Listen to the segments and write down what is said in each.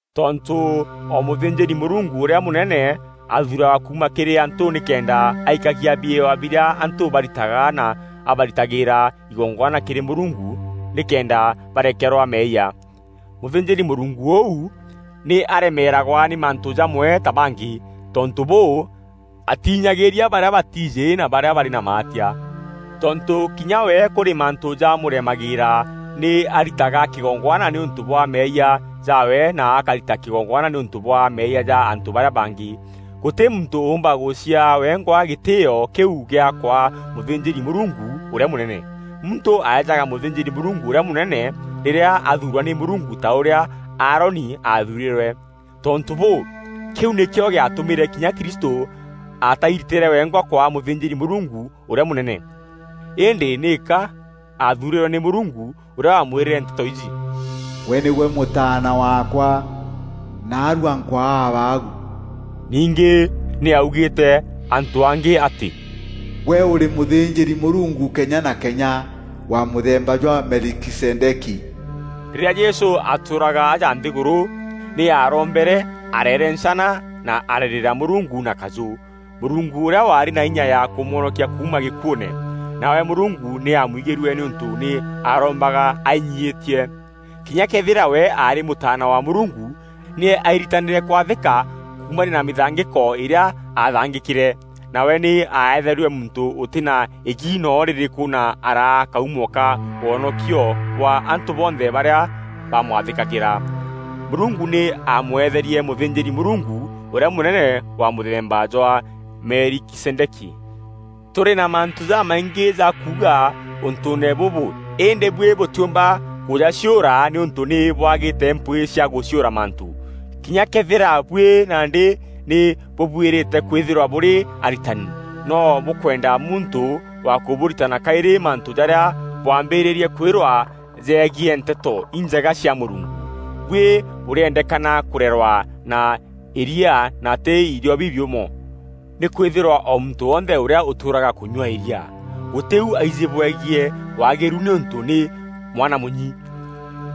Tontû o mûthînjîri-Mûrungu ûrîa mûnene athuuragwa kuuma kîrî antû nîkenda aikagia biewa birîa antû baritaga na abaritagîra igongwana kîrî Mûrungu nîkenda barekerwa meeyia. Mûthînjîri-Mûrungu ûu, nî aremeeragwa nî mantû jamwe ta bangî. Tontû bûû, atiinyagîîria barîa batiijî na barîa barî na maatia. Tontû kinya we kûrî mantû jamûremagîîra, nî aritaga kîgongwana nîûntû bwa meeyia jaawe na akarita kîgongwana nîûntû bwa meeyia ja antû barîa bangî. Gûtî muntû ûûmba gûciaa wengwa gîtîîo kîu gîa kwaa mûthînjîri-Mûrungu ûrîa mûnene. Muntû aejaga mûthînjîri-Mûrungu ûrîa mûnene rîrîa athuurwa nî Mûrungu ta ûrîa Aaroni aathuurîrwe. Tontû bûû, kîu nîkîo gîatûmîre kinya Kristû atairitîre wengwa kwaa mûthînjîri-Mûrungu ûrîa mûnene, îndî nîka aathuurîrwe nî Mûrungu ûrîa wamwîrîre nteto iji: “Gwe nîgwe Mûtaana waakwa, naarua nkwaa Abaagu.” Ningî nî augîîte antû angî atî, “Gwe ûrî mûthînjîri-Mûrungu kenya na kenya, wa mûthemba jwa Melikizedeki.” Rîrîa Jesû aatûûraga aja nthîgûrû nî aarombere areerencana na ararîrîra Mûrungu na kajû, Mûrungu ûrîa waarî na inya ya kûmwonokia kuuma gîkuûne. Nawe Mûrungu nî aamwigîrue nîûntû nî aarombaga ainyiîtie. Kinya këethîra we aarî Mûtaana wa Mûrungu, nî airitanîre kwathîka kuumania na mîthangîko îrîa aathangîkîre. Nawe nî aetherue muntû ûtî na îgi noo rîrîkû na araa kaumo ka wonokio bwa antû bonthe barîa bamwathîkagîra. Mûrungu nî aamweetherie mûthînjîri-Mûrungu ûrîa mûnene wa mûthemba jwa Melikizedeki. Tûrî na mantû jamaingî ja kuuga ûntûûne bûbû îndî buî bûtîumba kûjaciûra nîûntû nî bwagîte mpwîî cia gûciûra mantû. Kinya këethîra buî nandî nî bûbuîrîte kwîthîrwa bûrî aritani, no bûkwenda muntû wa kûbûritana kaîrî mantû jarîa bwaambîrîrie kwîrwa jegiî Nteto Injega cia Mûrungu. Buî bûrîendekana kûrerwa na îria na tî irio bibiûmo. Nîkwîthîrwa o muntû wonthe ûrîa ûtûûraga kûnyua îria, gûtî û aijî bwegiî waagîru nîûntû nî mwana mûnyi.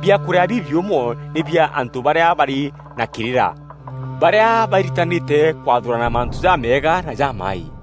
Biakûrîa bibiûmo nî bia antû barîa barî na kîrîra, barîa bairitanîte kwathûrana mantû jameega na jamaaî.